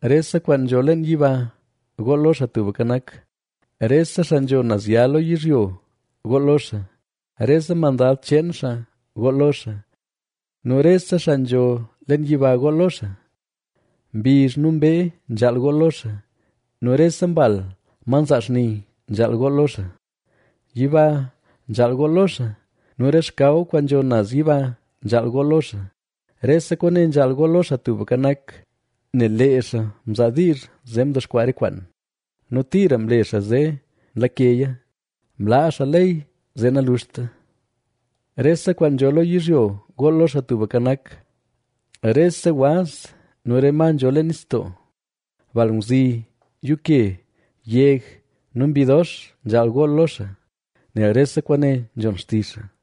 Rese kwaan nzho leen yiba gool lo Xaa Tubka Nak; rese xaa nzho naz ya lo yizhyo gool lo xaa. Rese mandad cheen xaa gool lo xaa nu rese xaa nzho leen yiba gool lo xaa. Mbizh nu mbee nzhaal gool lo xaa nu rese mbal, ma nzaa xni, nzhaal gool lo xaa. Yiba nzhaal gool lo xaa nu re xkaw kwaan nzho naz yiba nzhaal gool lo xaa. Rese kwaane nzhaal gool lo xaa, lo Xaa Tubka Nak, nel lee xaa mzaa diizh zee mdexkwaa re kwaan. Nu tira mle xaa zee nlakeya; mlaa xaa ley zee naluxta. Rese kwaan nzho lo yizhyo gool lo Xaa Tubka Nak; rese waz, nu re ma nzho leen nistoo; bal ngwzi, yuuke, yeg, nu mbi dox, nzhaal gool lo xaa, nel rese kwaane nzhon xtizh xaa.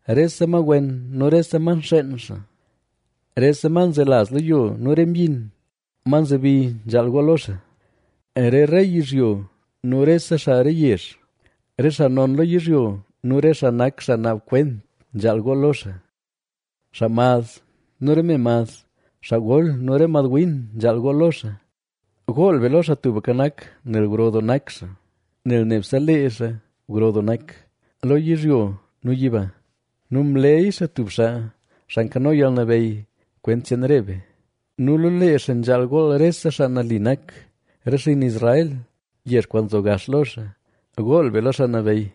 Rese ma wen nu rese ma nxeen xaa, rese ma nzelaz lo yo nu re myin, ma nzebi nzhaal gool lo xaa. Re rey yizhyo nu rese xaa re yezh, re xaa non lo yizhyo nu re xaa nak xaa naab kwent nzhaal gool lo xaa. Xaa mad nu re me mad, xaa gol, nu re mad win nzhaal gool lo xaa. Gool be lo Xaa Tubka Nak, nel gro doo nak xaa, nel nebse le xaa gro doo nak, lo yizhyo nu yiba. Nu mleyy xaa tub xaa, xaa nkano yalnabeyy, kwent cheen re be nu lo lee xaa nzhaal gool rese xaa nali nak, re xinn Israel, yezh kwaan nzo gax lo xaa. ¡Gool be lo Xaa Nabeyy!